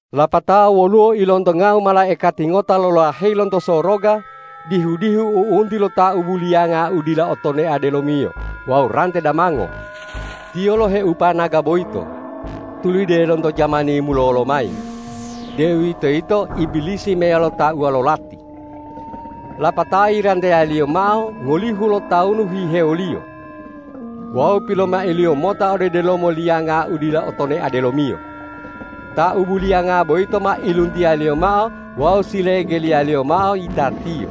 Lapatao woluwo ilontongau malaikati ngota lolaheyi lonto soroga dihu-dihu u'unti lo taubu liyanga u dila otonea delomiyo wawu rante damango. Tiyo loheupa naga boyito, tulide lonto jamani mulolo mayi, deuwitoyito Ibilisi meyalo tauwa lo lati. Lapatao yiranteyaliyo mao ngolihu lotawunu hihewoliyo. Wawu pilomailiyo mota ode delomo liyanga u dila otonea delomiyo. Taubu liyanga boyito ma iluntiyaliyo mao wawu silegeliyaliyo mao yitatiyo,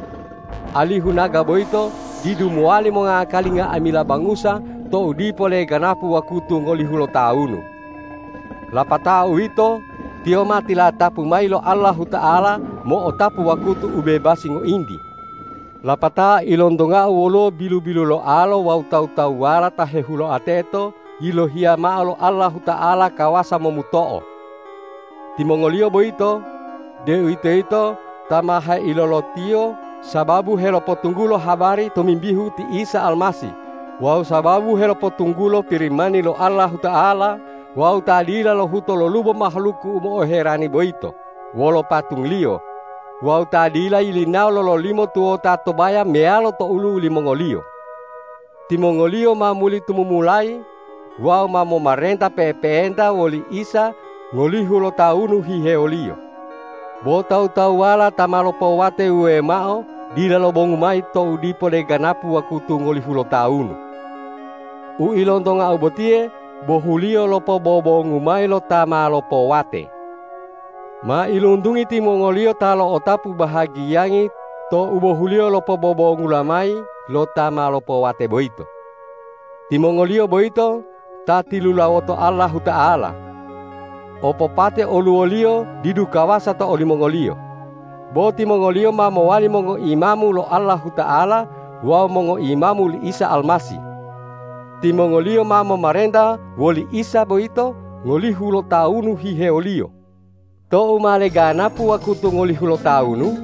alihu naga boyito didu mowali mongakali nga'amila bangusa tou dipo leganapu wakutu ngolihu lotawunu. Lapatao uwito, tiyo ma tilatapu mayi lo Allahuta'ala mo'otapu wakutu u bebasi ngointi. Lapatao ilontongau woluwo bilu-biluloalo wawu tawu-tawuwala ta hehuloa teto yilohiya mao lo Allahuta'ala kawasa momuto'o. Timongoliyo boyito, deuwitoyito ta ma heilolotiyo sababu helopotunggulo habari tomimbihu ti Isa Almasih wawu sababu helopotunggulo Pirimani lo Allahuta'ala wawu ta dila lohuto lolubo mahaluku u mo'oherani boyito wolo patungliyo wawu ta dila yilinawo lololimo tuwota to baya meyalo to olu'u limongoliyo. Timongoliyo ma muli tumumulayi wawu ma momarenta pe'epe'enta woli Isa ngolihu lotawunu hihewoliyo. Bo tawu-tawuwala ta ma lopowate wuwewo mao dila lobongu mayi tou dipo leganapu wakutu ngolihu lotawunu. U ilontongau botiye bohuliyo lo pobobongu mayi lo ta ma lopowate. Mailuntungi timongoliyo ta lo'otapu bahagiyangi to ubohuliyo lo pobobongula mayi lo ta ma lopowate boyito. Timongoliyo boyito ta tilulawoto Allahuta'ala. Opopate oluwoliyo didu kawasa to olimongoliyo. Bo timongoliyo ma mowali mongoimamu lo Allahuta'ala wawu mongoimamu li Isa Almasih. Timongoliyo ma momarenta woli Isa boyito ngolihu lotawunu hihewoliyo. Tou ma leganapu wakutu ngolihu lotawunu,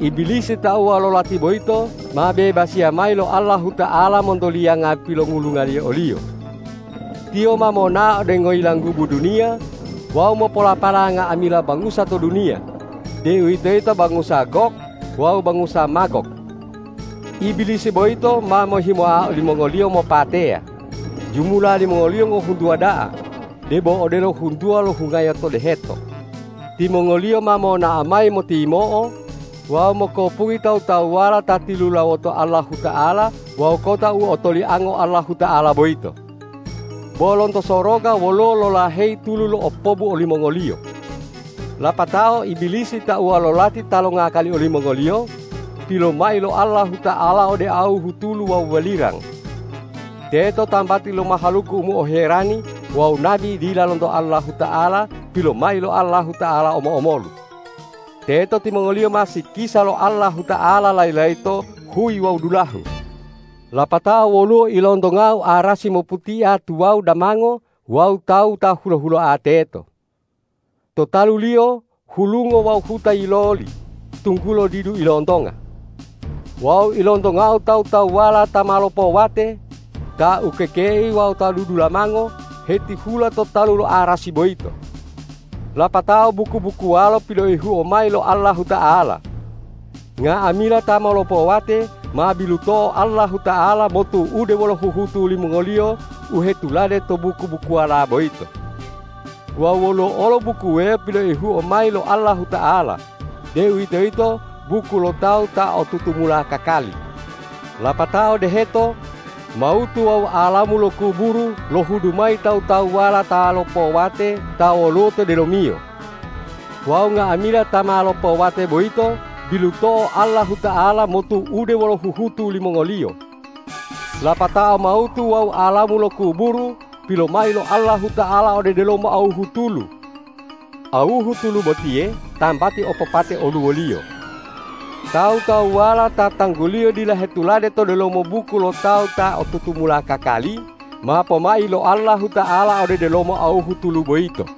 Ibilisi tauwa lo lati boyito ma bebasiya mayi lo Allahuta'ala monto liyanga pilongulungaliyo oliyo. Tiyo ma monao ode ngoyilanggubu duniya wawu mopolapala nga'amila bangusa to duniya, deuwitoyito bangusa Gog wawu bangusa Magog. Ibilisi boyito ma mohimoa olimongoliyo mopateya, jumula limongoliyo ngohuntuwa da'a debo odelo huntuwa lo hungayo to deheto. Timongoliyo ma monao mayi motiyimo'o wawu mokopungi tawu-tawuwala ta tilulawoto Allahuta'ala wawu kota u otoliango Allahuta'ala boyito. Bo lonto soroga woluwo lolaheyi tulu lo'opobu olimongoliyo. Lapatao Ibilisi tauwa lo lati ta longakali olimongoliyo, pilomai lo Allahuta'ala ode awuhu tulu wawu walirang. Teto tambati lo mahaluku u mo'oherani wawu nabi dila lonto Allahuta'ala pilomai lo Allahuta'ala omo-omolu. Teto timongoliyo ma sikisa lo Allahuta'ala layi-layito huyi wawu dulahu. Lapatao woluwo ilontongau arasi moputia tuwawu damango wawu Tawu ta hulo-huloa teto. To talu-Liyo hulungo wawu huta yiloli, tunggulo didu ilontonga. Wawu ilontongau tawu-tawuwala ta ma lopowate, ta ukekei wawu ta dudulamango hetihula to talu lo arasi boyito. Lapatao buku-bukuwalo piloihuo mayi lo Allahuta'ala. Nga'amila ta ma lopowate ma biluto'o Allahuta'ala motu'ude wolo huhutu limongoliyo u hetulade to buku-bukuwala boyito. Wawu woluwo olo buku wuwewo piloihuo mayi lo Allahuta'ala, deuwitoyito buku lo tawu ta o tutumula kakali. Lapatao deheto, mawutu wawu alamu lo kuburu lohudu mayi tawu-tawuwala ta lopowate ta woluwo to delomiyo. Wawu nga'amila ta ma lopowate boyito biluto'o Allahuta'ala motu'ude wolo huhutu limongoliyo. Lapatao mawutu wawu alamu lo kuburu, pilomai lo Allahuta'ala ode delomo awuhu tulu. Awuhu tulu botiye tambati opopate oluwoliyo. Tawu-tawuwala ta tangguliyo dila hetulade to delomo buku lo tawu ta o tutumula kakali, ma pomai lo Allahuta'ala ode delomo awuhu tulu boyito.